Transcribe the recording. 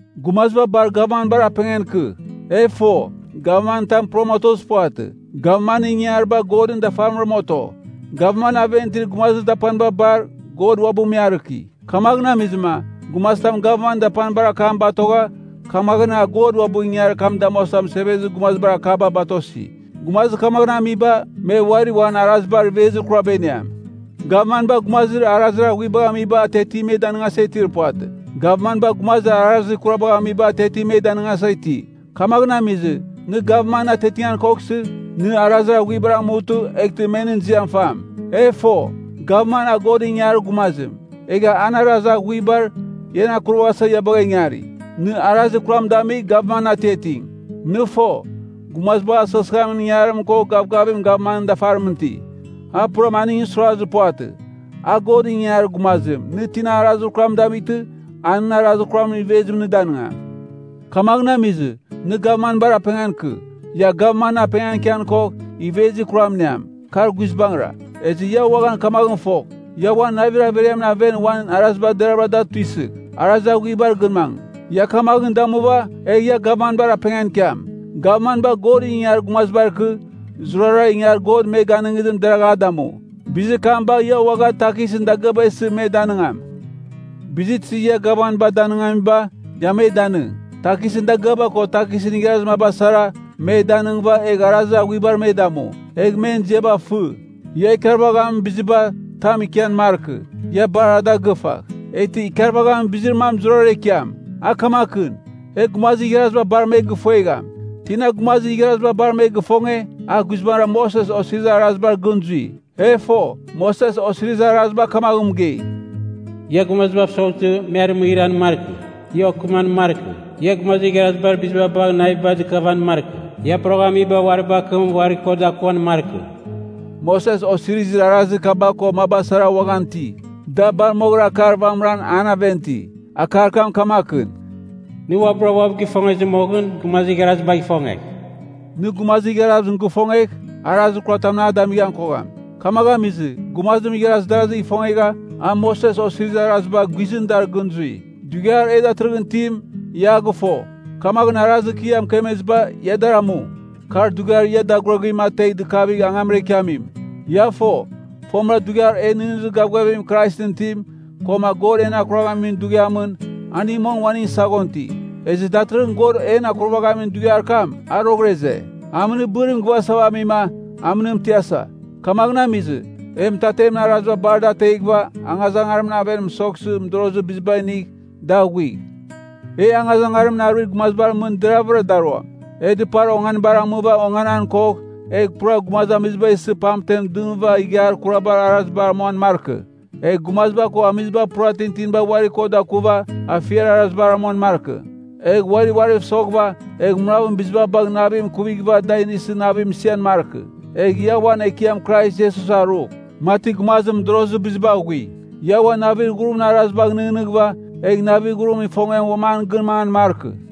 Gumaziba bar gavmanbar apengan ikɨ. E fo, gavman tam puram otozir puvatɨ. Gavmanɨn ingangariba Godɨn dafarimram oto. Gavmanɨn aven itir gumazir dapaniba bar, God uabɨ me arɨki. Kamaghɨn amizɨma, gumazitam gavmanɨn dapanibar akam batogha, kamaghɨn a God uabɨ ingangarir kam damuasa mɨsevezir gumazibar akaba batosi. Gumazir kamaghɨn amiba, me uari uan arazibar ivezir kuraba iniam. Gavmanba gumazir arazir aghuibagh amiba atiatim me danɨngasa itir puvatɨ. Gavmanba gumazir arazir kurabagh amiba atiatim me danɨngasa iti. Kamaghɨn amizɨ, nɨ gavmanɨn atiatingan koghsɨ, nɨ arazir aghuibar amutɨ, eghtɨ me nɨn ziam fam. E fo, gavman a Godɨn ingangarir gumazim, egha an arazir aghuibar, ian akurvaghasa ia bagha ingari. Nɨ arazir kuram damigh gavmanɨn atiating. Nɨ fo, gumazibagh asɨghɨsɨghamin ingangarim ko gavgavim gavmanɨn dafarimɨn iti, a puram aningɨn suirazir puvatɨ. A Godɨn ingangarir gumazim, nɨ tina arazir kuram damightɨ, a nɨn arazir kuramɨn ivezim nɨ danɨngam. Kamaghɨn amizɨ, nɨ gavmanbar apengan ikɨ. Ia gavman apengan ikian kogh, ivezir kuram iniam, kar guizbangɨra. Ezɨ ia uaghan kamaghɨn fogh, ia uan navir averiamɨn aven uan araziba deravɨra da tuisɨgh, arazir aghuibar gɨn mangɨ. Ia kamaghɨn damuva, egh ia gavmanbar apengan ikiam. Gavmanba Godɨn ingangarir gumazibar ikɨ, zurara ingangarir God me ganɨngizim deragh a damu. Bizir kam bagh ia uaghan takisɨn dagɨaba isɨ me danɨngam. Bizir tizir ia gavmanba danɨngamiba, ia me danɨng. Takisɨn dagɨaba ko takisɨn igharazir maba sara, me danɨngɨva, egh arazir aghuibar me damu, egh men ziaba fɨ. Ia ikarvaghamin biziba, tam ikian markɨ, ia bar da gɨfagh. Eghtɨ ikarvaghamin bizir mam zurara ikiam. A kamakɨn: e gumazir igharaziba bar me gifuegham. Tina gumazir igharaziba bar me gifonge, a guizbangɨra Moses Osirizir Arazibar gɨn zui. E fo, Moses Osirizir Araziba kamaghɨn mɨgei, “Ia gumazibav soghtɨ, me arɨmɨghɨran markɨ. Ia okɨman markɨ. Ia gumazir igharazibar biziba bagh naviba dɨkavan markɨ. Ia poroghamiba uari bakɨm uari ko dakuan markɨ.” Moses Osirizir Arazir kaba ko maba sara uaghan iti, da bar moghɨra akar vamɨra an aven iti, akar kam kamakɨn: “Nɨ uabɨra uabɨ gifongezir moghɨn, gumazir igharazibagh ifongegh.” Nɨ gumazir igharazim gifongegh, arazir kuratamɨn a damighan kogham. Kamaghɨn amizɨ, gumazim igharaz darazigh ifongegha, a Moses Osirizir Araziba guizɨn dar gɨn zui. Dughiar e datɨrɨghɨn itim, ia a gɨfo, kamaghɨn arazir kɨ ia mɨkemeziba ia dar amu. Kar dughiar ia daguraguim ategh dɨkavigh angamra ikiamim. Ia fo, fomɨra dughiar e nɨghnɨzir gavgavim Kraisɨn itim, koma God en akuraghamin dughiamɨn, aning mong uaningɨn saghon iti. Ezɨ datɨrɨghɨn God en akurvaghamin dughiar kam a roghɨra ize. Amɨnɨrbɨrim gɨvasava amima, amɨnim tiasa. Kamaghɨn amizɨ, e mɨtatemɨn araziba bar dar ateghɨva angazangarimɨn aven mɨsoghsɨ mɨdorozir biziba inigh dar aghuigh. E angazangarimɨn aruir gumazibar mɨn deraghvɨra daruam. E dɨpar onganibar amɨva onganan kogh, egh pura gumazamiziba isɨ pamten dɨmɨva ighiar kurabar arazibar amuan markɨ. Egh gumaziba ko amiziba pura tintinibar uari ko dakuva, afiar arazibar amuan markɨ. Egh uari uariv soghɨva, egh munavɨn biziba bagh navim ikuvighɨva da inisɨ navim isian markɨ. Egh ia uan Ekiam Krais Iesus arugh, mati gumazim mɨdorozir biziba aghui. Ia uan navir ghurimɨn arazibagh nɨghnɨghɨva, egh navir ghurimɨn ifongiam uam an gɨn mangan markɨ.